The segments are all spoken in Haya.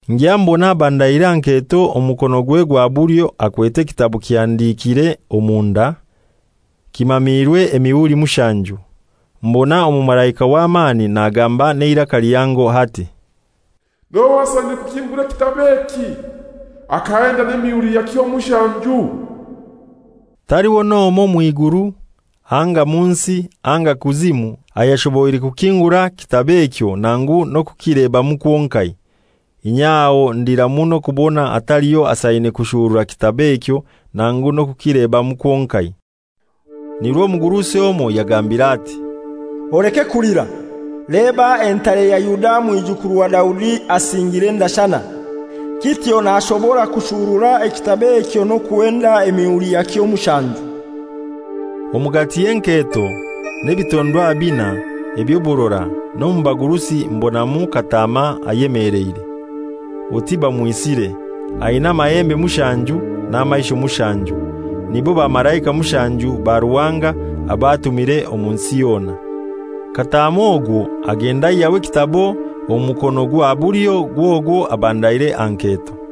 Ngya mbona abandaire aha nketo omu mukonogwe gwa bulyo akwete ekitabo kihandikire omunda, kimaamirwe emihuri mushanju. Mbona omumalaika w'amani nagamba n'eiraka lihango ati, «Nohai asaine kukingura ekitabo eki, akahenda n'emihuri yakyo mushanju?» Taliho n'omoi mw'iguru anga mu nsi anga kuzimu ayashoboire kukingura kitabo ekyo nangu n'okukilebamu kwonkai. Inye aho ndira muno kubona hataliyo asaine kushurura kitabo ekyo nangu n'okukilebamu kwonkai. Nirwo omugurusi omoi yangambire ati, «Oleke kulira. Leba entare ya Yuda, Mwijukuru wa Daudi asingire endashana, kityo nashobora kushurura ekitabo ekyo n'okuhenda emihuri yakyo mushanju.» Omugati y'enketo n'ebitondwa binai eby'oburora n'omu bagurusi mbonamu Kataama ayemeleire, oti bamwisire, aina amahembe mushanju n'amaisho mushanju, nibo bamalaika mushanju ba Ruhanga abo atumire omu nsi yona. Kataama ogwo agenda aihyaho ekitabo omu mukono gwa bulyo gw'ogwo abandaire aha nketo.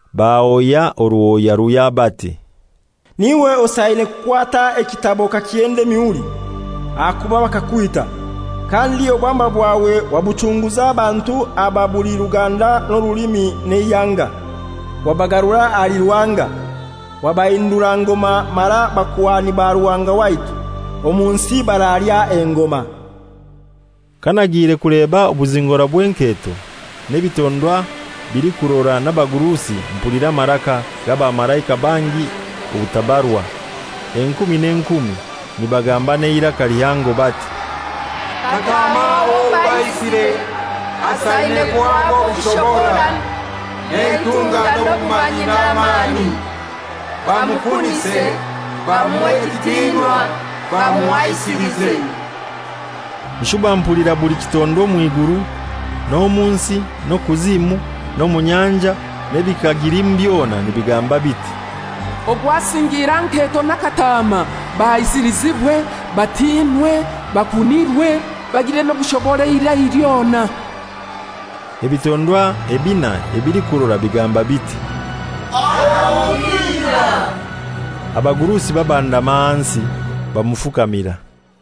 bahoya oruhoya ruhya bati, «N'iwe osaine kukwata ekitabo okakihenda emihuri, ahakuba bakakwita, kandi obwamba bwawe wabuchunguza abantu aba buli ruganda n'orulimi n'eihanga, wabagarura ahali Ruhanga; wabahindura ngoma mara bakuhani ba Ruhanga waitu, omu nsi baralya engoma.» Kanagiire kuleba obuzingora bw'enketo, n'ebitondwa bilikurora n'abagurusi mpulira amaraka g'abamalaika bangi obutabarwa, enkumi n'enkumi, nibagamba n'eiraka lihango bati, «Kataama owo baisire, asaine kuhaba obushobora n'eitunga n'obumanyi n'amani, bamukunise, bamuhe ekitinwa, bamuhaisilize.» Nshuba mpulira buli kitondwa omw'iguru n'omu nsi n'okuzimu n'omu nyanja n'ebikagilimu byona nibigamba biti, «Ogwo asingiire aha nketo na Kataama bahaisilizibwe, batinwe, bakunirwe, bagire n'obushobora eirai lyona!» Ebitondwa ebinai ebilikurora bigamba biti, «Amina!» Abagurusi babandama ahansi, bamufukamira.